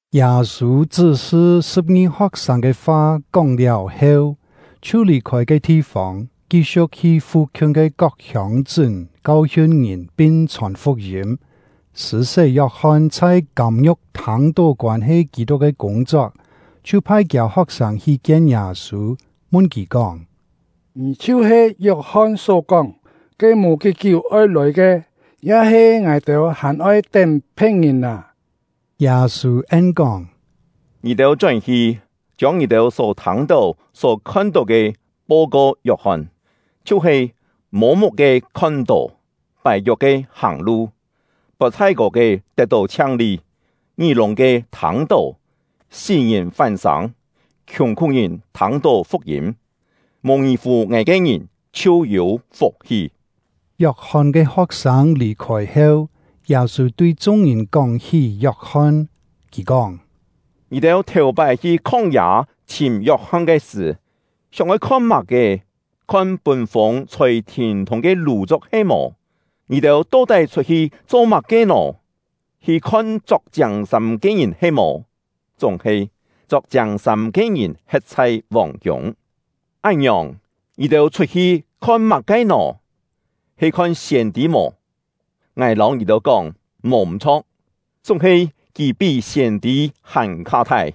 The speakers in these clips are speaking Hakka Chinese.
Yâ-sû chṳ́-sṳ sṳ̍p-ngi ho̍k-sâng ke fa kóng-liáu heu, chhiu lì-khôi ke thi-fông, ki-siu̍k hi fu-khiun ke kok hiông-chṳ́n kau-hiun ngìn pin chhòn fuk-yîm. Sṳ̂-sé Yok-hon chhai kâm-ngiu̍k thâng-tó koân-he Kî-tuk ke kûng-chok, chhiu phai kiâ ho̍k-sâng hi kien Yâ-sû, mun kì kóng: “Ngì chhiu-he Yok-hon só-kóng, ke mò kí-kiú oi lòi ke, ya-he ngài-têu hàn oi tén phe̍t-ngìn â?” Yâ-sû en-kóng: “Ngì-têu chón-hi, chiông ngì-têu só thâng-tó, só khon-tó ke, po-ko Yok-hon, chhiu-he: Mô-muk-ke khon-tó, pài-kiok-ke hàng-lu, pot thái-kô ke tet-tó chhiang-li, ngí-lûng-ke thâng-tó, sí-ngìn fán-sâng, khiùng-khú-ngìn thâng-tó fuk-yîm. Mò ngì-fù ngài ke ngìn chhiu yû fuk-hi!” Yok-hon ke ho̍k-sâng lì-khôi heu, Yâ-sû tui chung-ngìn kóng-hí Yok-hon, kì kóng: “Ngì-têu thèu-pái hi khóng-yâ chhìm Yok-hon ke sṳ̀, sióng-oi khon má-ke? Khon pûn-fûng chhôi thîn-thûng ke lù-chuk he-mò? Ngì-têu to-tái chhut-hi cho má-ke nò? Hi khon chok chiâng-sâm ke ngìn he-mò? Chúng-he, chok chiâng-sâm ke ngìn he̍t chhai vòng-kiûng. Án-ngiòng, ngì-têu chhut-hi khon má-ke nò? He khon siên-tî mò? Ngài lâu ngì-têu kóng, mò m̀-chho̍k, chúng-he kì pí siên-tî hàn-kha thai.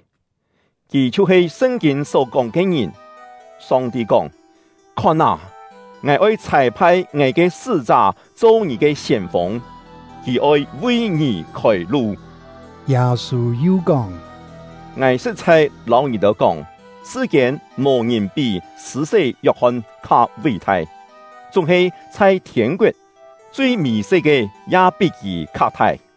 Kì chhiu-he Sṳn-kîn só-kóng ke ngìn. Song-ti kóng: ‘Khon â, Ngài oi chhâi-phai Ngài ke sṳ́-chá cho ngì ke siên-fûng; kì oi vi ngì khôi-lu.’” Yâ-sû yu kóng: “Ngài sṳ̍t-chhai lâu ngì-têu kóng, sṳ-kiên mò-ngìn pí Sṳ̂-sé Yok-hon kha ví-thai, chúng-he chhai thiên-koet, chui mì-se ke ya pí kì kha thai!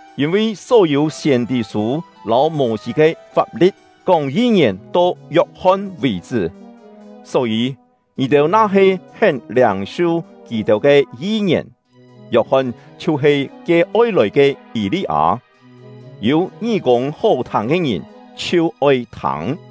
Yîn-vi só-yû siên-tî-sû lâu Mô-sî ke fap-li̍t kóng yi-ngièn to Yok-hon vì-chṳ́; só-yî, ngì-têu na-he hén liâng-su kì-têu ke yi-ngièn, Yok-hon chhiu-he ke oi lòi ke Yî-li-â. Yû ngí-kûng hó-thâng ke ngìn, chhiu oi thâng!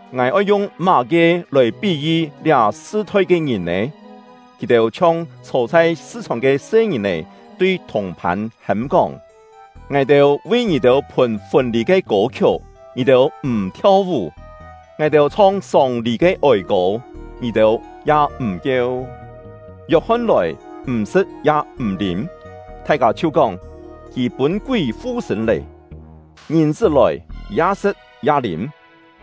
“Ngài oi yung má-ke lòi pí-yi liá sṳ-thoi ke ngìn nè? Kì-têu chhiong chhô chhai sṳ-chhòng ke se-ngìn-è tui thùng-phân hêm-kóng: ‘Ngài-têu vi ngì-têu phùn fûn-lî ke kô-khiuk, ngì-têu m̀ thiau-vú! Ngài-têu chhong sông-lî ke ôi-kô, ngì-têu ya m̀ kieu!’ Yok-hon lòi, m̀ sṳ̍t ya m̀ lîm, thai-kâ chhiu kóng: ‘Kì pûn kúi fu-sṳ̂n lê!’ Ngìn-chṳ́ lòi, ya sṳ̍t ya lîm,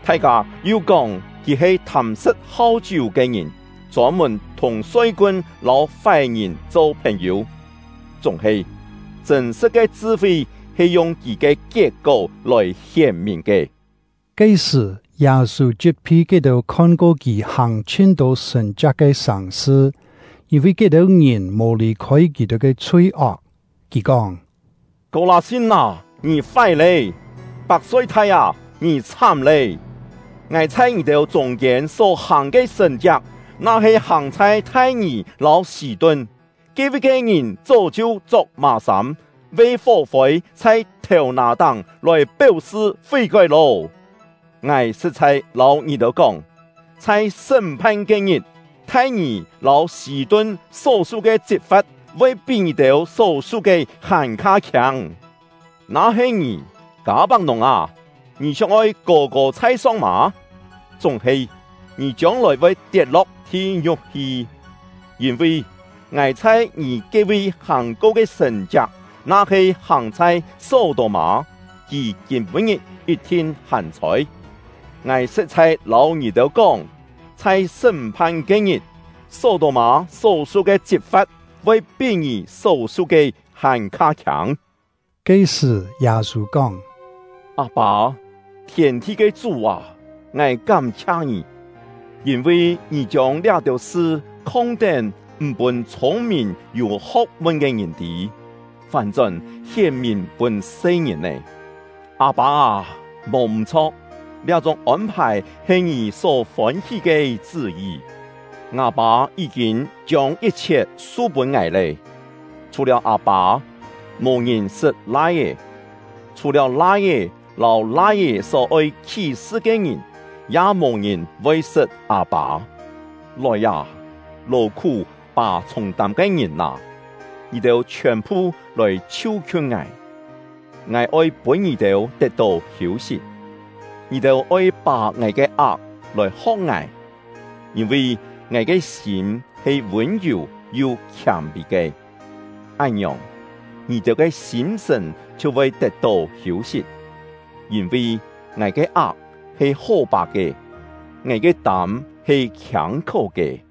thai-kâ yu kóng: ‘Kì he thâm-sṳ̍t hau-chiú ke ngìn, chôn-mùn thùng soi-kun lâu fái-ngìn cho phèn-yû!’ Chúng-he, chṳ̂n-sṳ̍t ke chṳ-fi he yung kì ke kiet-kó lòi hién-mìn ke.” Ke-sṳ̀, Yâ-sû chit-phi ke-têu khon-ko kì hàng chhin-tô sṳ̀n-chiak ke sàng-sṳ, yîn-vi ke-têu ngìn mò lì-khôi kì-têu ke chhui-ok. Kì kóng: “Kô-lâ-sin â, ngì fái lé! Pak-soi-thai â, ngì chhám lé! Ngài chhai ngì-têu chûng-kiên só-hàng ke sṳ̀n-chiak, na-he hàng chhai Thai-ngì lâu Sî-tun, ke-vi ke ngìn chó chhiu chok mà-sâm, ve fó-fôi chhai thèu-nà-táng lòi péu-sṳ fí-kói lô! Ngài sṳ̍t-chhai lâu ngì-têu kóng, chhai sṳ́m-phan ke-ngit, Thai-ngì lâu Sî-tun só-su ke chit-fa̍t voi pí ngì-têu só-su ke hàn-kha khiâng! Na-he ngì, Kâ-pak-nùng â, ngì sióng-oi kô-kô chhai-song mâ? Chúng-he, ngì chiông-lòi voi tiet-lo̍k thi-ngiu̍k hi! Yîn-vi, ngài chhai ngì ke-vi hàng-ko ke sṳ̀n-chiak na-he hàng chhai Só-tô-mâ, kì kîm-pû-ngit yit-thin hàn-chhôi! Ngài sṳ̍t-chhai lâu ngì-têu kóng, chhai sṳ́m-phan ke-ngit, Só-tô-mâ só-su ke chit-fa̍t voi pí ngì só-su ke hàn-kha khiâng!” Ke-sṳ̀, Yâ-sû kóng: “Â-pâ, thiên-thi ke Chú â, ngài kám-chhia Ngì, yîn-vi Ngì chiông liá-têu sṳ khong-tén m̀ pûn chhûng-mìn yû ho̍k-mun ke ngìn tî, fán-chón hién-mìn pûn se-ngìn-è. Â-pâ â, mò m̀-chho̍k, liá-chúng ôn-phài he Ngì só fôn-hí ke chṳ́-yi. “Ngâ Pâ yí-kîn chiông yit-chhiet su-pûn ngài lé! Chhù-liáu Â-pâ, mò-ngìn sṳt Lai-é; chhù-liáu Lai-é lâu Lai-é só-oi khí-sṳ ke ngìn, ya mò-ngìn voi sṳt Â-pâ. “Lòi â, lò-khú pà chhûng-tâm ke ngìn â, ngì-têu chhiòn-phu lòi chhiu-khiun ngài, ngài oi pûn ngì-têu tet-tó hiû-sit. Ngì-têu oi pà ngài ke ak lòi ho̍k ngài, yîn-vi ngài ke sîm he vûn-yù yu khiâm-pî ke; án-ngiòng, ngì-têu ke sîm-sṳ̀n chhiu voi tet-tó hiû-sit. Yîn-vi ngài ke ak he hó-pà ke; ngài ke tâm he khiâng-khó ke.”